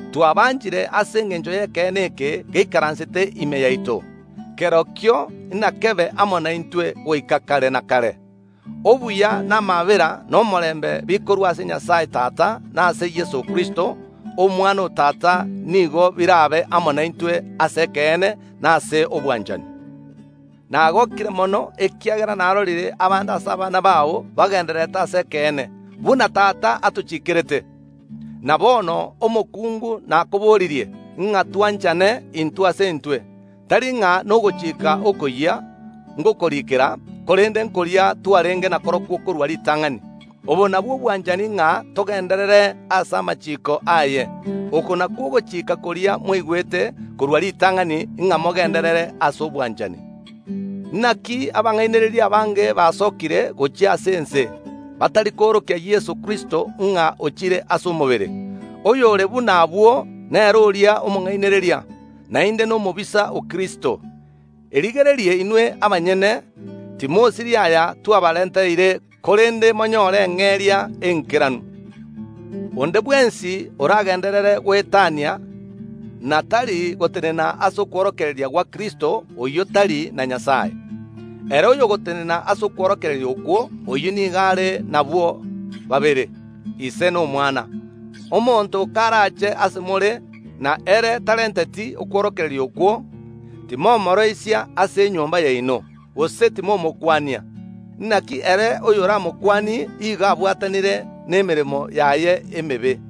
Twabanchire ase engencho y’ekeene eke geikaransete ime yaito, kerokio inakebe amo naintwe goika kare na kare. Obuya, na amaabera, na omorembe bikorwa ase Nyasae Tata na ase Yeso Kristo, Omwana o Tata, nigo birabe amo naintwe ase ekeene na ase obwanchani. Nagookire mono ekiagera narorire abande ase abana bao bagendererete ase ekeene, buna Tata atochikerete. Na bono, omokungu, nakoboririe ng’a twanchane intwe ase intwe. Tari ng’a nogochika okoyia ngokoriikera, korende nkoria twarenge nakorokwo korwa ritang’ani. Obo nabwo obwanchani ng’a togenderere ase amachiiko aye. Oko nakwo ogochika koria mwaigwete korwa ritang’ani, ng’a mogenderere ase obwanchani. Naki abang’ainereria abange baasokire gochia ase ense, abatari koorokia Yeso Kristo ng’a ochire ase omobere. Oyore buna abwo, nere oria omong’ainereria, naende nomobisa o Kristo. Erigererie inwe abanyene timosiria aya twabarenteire, korende monyoore eng’eria eng’ikeranu. Onde bwensi oragenderere goetania, na tari gotenena ase okworokereria gwa Kristo, oyio tari na Nyasae. Ere oyogotenena ase okworokereria okwo, oyio nigo are nabwo babere, Ise na Omwana. Omonto karache ase more, na ere tarenteti okworokereria okwo, timomooroisia ase enyomba yaino, gose timomokwania. Naki ere oyoramokwanie igo obwatanire nemeremo yaye emebe.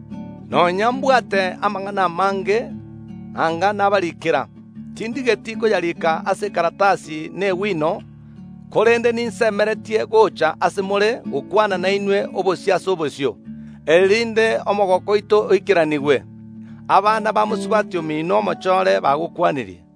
Nonya mbwate amang’ana amange nanga nabariikera, tindigeti koyarika ase ekaratasi na egwino, korende ninsemeretie gocha ase more gokwana nainwe obosio ase obosio, erinde omogooko oito oikeranigwe. Abana ba mosubati omino omochoore bagokwanirie.